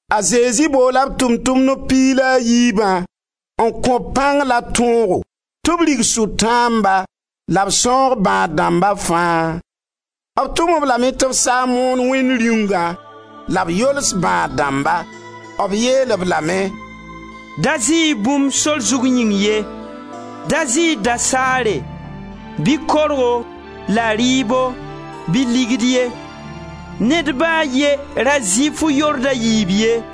A Zezi boola b Tʋʋm-tʋmdb piig la a yiibã n kõ-b pãng la tõogo tɩ b rig sʋtãamba la b sãoog bãad-dãmba fãa. B tʋm-b lame tɩ b sa n moon Wẽnd Rĩungã la b yols bãad-dãmba. B yeel-b lame: «Da zɩ-y bũmb sor zug yĩng ye. Da zɩ-y dasaare bɩ korgo la rɩɩbo bɩ ligd ye. Ned ba a ye ra zɩ fu-yord a yiib ye.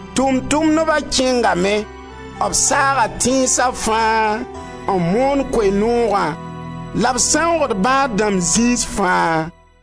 Tʋʋm-tʋʋmdba kẽngame, b saaga tẽnsa fãa n moon Koe-noogã la b sãoogd bãad-dãmb zĩis fãa.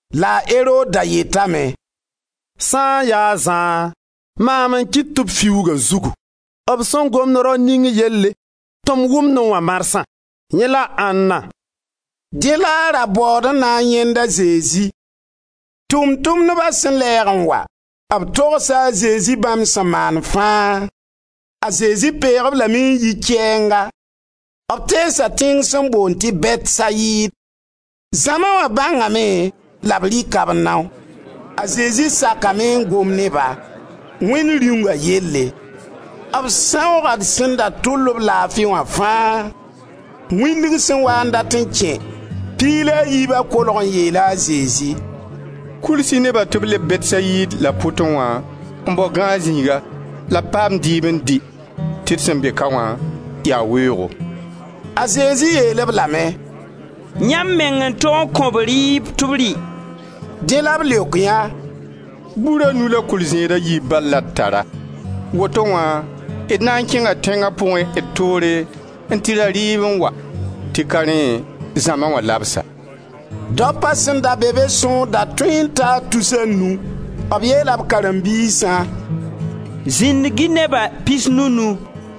La a Erod da yetame: «Sã n ya a Zã, mam n kɩt tɩ b fiuug a zugu. B sẽn gomd rao ning yelle tɩ m wʋmnẽ wã marsã, yẽ la ãnna?» Dẽ la a ra baood n na n yãend a Zezi. Tʋʋm-tʋmdba sẽn lɛɛg n wa, b togsa a Zezi bãmb sẽn maan fãa. A Zezi peeg-b lame n yi kɛɛnga; b teesa tẽng sẽn boond tɩ Bɛtsayid. Zãma wã bãngame la b rɩka b nao. A Zezi sakame n gom ne-ba, Wẽnd Rĩunga yelle; b sãooga sẽn da tʋl-b laafi wã fãa. Wĩndg sẽn waa n dat n kẽ, piig la a yiibã kolg n yeela a Zezi: «Kuls-y neba tɩ b leb Bɛtsayid la pʋtẽ wã n bao gãag zĩiga la b paam dɩɩb n dɩ tɩ d sẽn be ka wã yaa weoogo.» A Zezi yeel-b lame: «Yãmb meng n tog n kõ-b rɩɩb tɩ b rɩ.» Dẽ la b leok yã: «Bur a nu la kʋɩl-zẽed a yiib bal la d tara. Woto wã d na n kẽnga tẽnga pʋgẽ d toore n tɩ ra rɩɩb n wa, tɩ ka rẽ zãma wã labsa.» Daopa sẽn da be be sõor da tõe n taa tus a nu. B yeela b karen-biisã: «Zĩndg-y neba pisnu-nu.»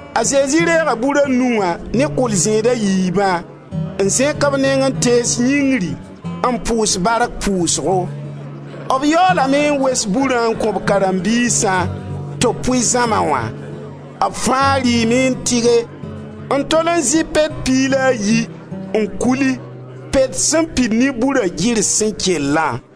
A Zezi reega bur a nu wã ne kʋɩl-zẽed a yiibã n zẽk b neng n tees yĩngri n pʋʋs bark pʋʋsgo. B yaoolame n wes burã n kõ b karen-biisã tɩ b pʋɩ zãma wã. B fãa rɩɩme n tɩge n tol zɩ pet piig la a yi, n kuli, pet sẽn pid ne bura girs sẽn kellã.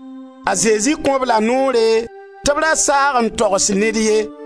A Zezi kõ-b la noore tɩ b ra saag n togs ned ye.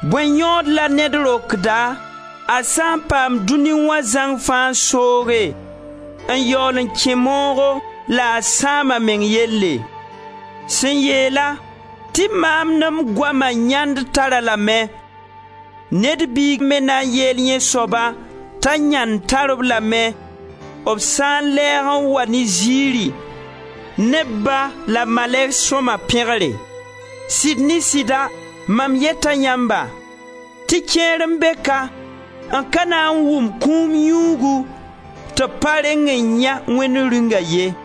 Bõe yõod la ned rokda a sã n paam dũni wã zãng fãa n sooge, n yaool n kẽ moogo la a sãam a meng yelle? Sẽn yeela tɩ maam ne m goama yãnd tar-a lame, Ned Biig me na yeel yẽ soaba t'a yãnd tar-b lame, b sã n lɛɛg n wa ne zɩɩri, ne b Ba la malɛgs sõma pẽgre. Sɩd ne sɩda, mam yeta yãmba tɩ kẽer n be ka n ka na n wʋm kũum yũugu tɩ b pa reng n yãe Wẽnd Rĩunga ye.»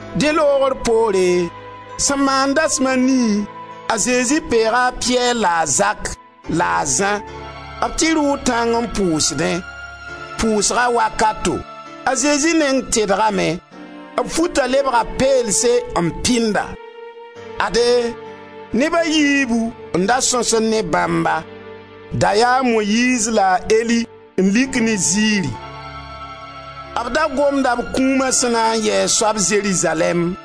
Dẽ loogr poore, sẽn maan dasm a nii, a Zezi peega a Piyɛr la a Zak, la a Zã. B tɩ rʋʋ tãng n pʋʋsdẽ. Pʋʋsga wakato, a Zezi neng tedgame. B futa lebga peelse n pɩnda. Ade, neb a yiibu n da sõsd ne bãmba: da yaa a Moyiiz la a Eli n lik ne zɩɩri. B da gomda b kũuma sẽn na n yɩ a soab Zerizalɛɛm.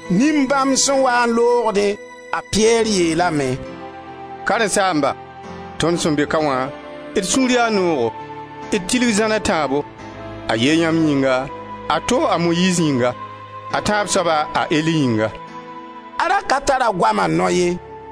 Nin-bãmb sẽn waa n loogdẽ, a Piyɛr yeelame: «Karen-saamba, tõnd sẽn be ka wã, d sũur yaa noogo. D tilg zãn a tãabo, a ye yãmb yĩnga, a to a Moyiiz yĩnga, a tãab soaba a Eli yĩnga.» A ra ka tar a goama nao ye.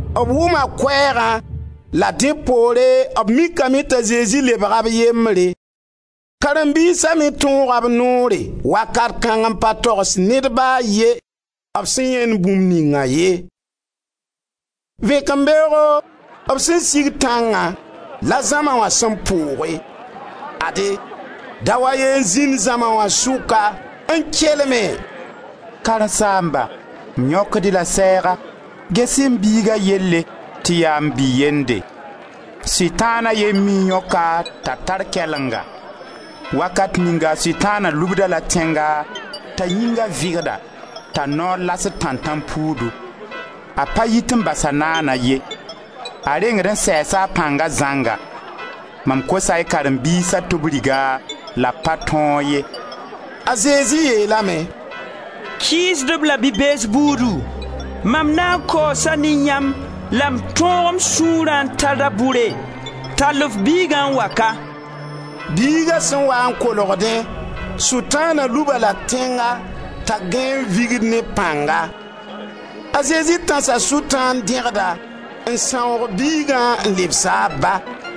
B wʋma koɛɛgã la dẽ pore b mikame t'a Zezi lebga b yembre. Karen-biisa me tõoga b noore wakat kãng n pa togs ned ba a ye b sẽn yãend bũmb ninga ye. Vẽkembeoogo, b sẽn sig tãngã la zãma wã sẽn pooge. Ade, dao a ye n zĩnd zãma wã sʋka n kelme: «Karen-saamba, m yõkd-y-la sɛɛga, ges-y m biiga yelle tɩ yaa m bi-yende. Sʋtãan a ye n mii n yõk-a t'a tar kɛlenga. Wakat ninga sʋtãana lubd-a la tẽnga t'a yĩnga vɩgda, t'a noor lasd tãntãnpuudu; a pa yit n bas-a naana ye. A rengd n sɛɛsa a pãnga zãnga. Mam kosa y karen-biisa tɩ b rig-a la b pa tõog ye.» A Zezi yeelame: «Kɩɩsdb la bi-bees buudu, mam na n kaoosa ne yãmb la m tõog m sũurã n ta da-bʋre? Tall f biigã n wa ka.» Biiga sẽn wa n kolgdẽ, sʋtãana lub-a-la tẽnga t'a gãe n vigd ne pãnga. A Zezi tãsa sʋtãan dẽgda, n sãoog biigã n lebs-a a ba.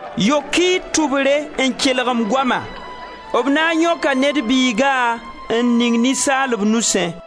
«Yok-y y tʋbre n kelg m goama: B na n yõka Ned Biiga n ning ninsaalb nusẽ.»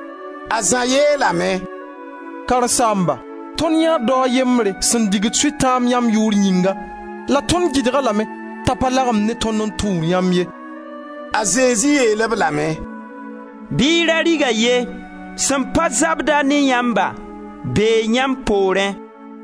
A Zã yeelame: «Karen-saamba, tõnd yãee dao a yembre sẽn digd sʋtãan yãmb yʋʋr yĩnga la tõnd gɩdg-a lame t'a pa lagem ne tõnd n tũud yãmb ye.» A Zezi yeel-b lame: «Bɩ y ra rig-a ye! Sẽn pa zabd-a ne yãmba bee yãmb poorẽ.»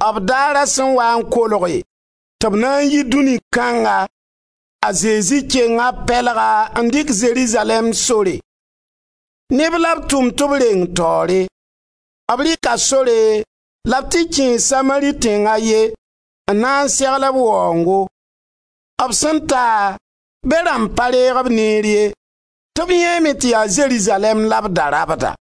B daara sẽn waa n kolge tɩ b na n yi dũni kãnga, a Zezi kenga b pɛlga n dɩk Zerizalɛɛm sore. Neb la b tʋm tɩ b reng taoore. B rɩka sore la b tɩ kẽe Samari tẽng a ye n na segl b waoongo. B sẽn ta, be rãmb pa reeg-b neer ye, tɩ b yãeeme tɩ yaa Zerizalɛɛm la b da rabda.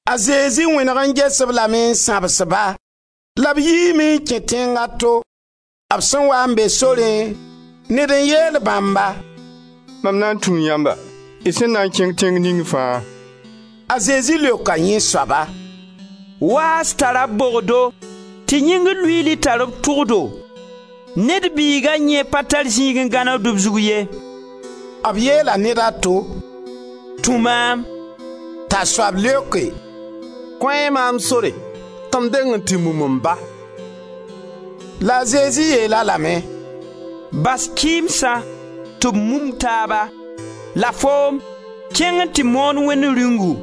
A Zezi wẽneg n ges-lame m sãbs-ba. La b yiime n kẽ tẽng a to. B sẽn waa n be sorẽ, ned n yeel bãmba: «Mam na n tũu yãmba, y sẽn na n kẽng tẽng ning fãa.» A Zezi leoka yẽ soaba: «Waas tara b bogdo tɩ yĩngr luiili tar b tʋgdo. Ned Biiga yẽ pa tar zĩig n gãnegd b zug ye.» B yeela ned a to: «Tũ maam!» T'a soab leoke: «Kõ-y maam sore tɩ m deng n tɩ mum m ba.» La a Zezi yeel-a lame: «Bas kɩɩmsa tɩ b mum taaba; la foom, kẽng n tɩ moon Wẽnd Rĩungu.»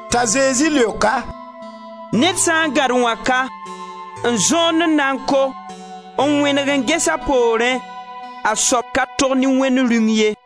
T'a Zezi leok-a: «Ned sã n gãd wãka n zõond n na n ko, n wẽneg n ges a poorẽ, a soab ka tog ne Wẽnd Rĩung ye.»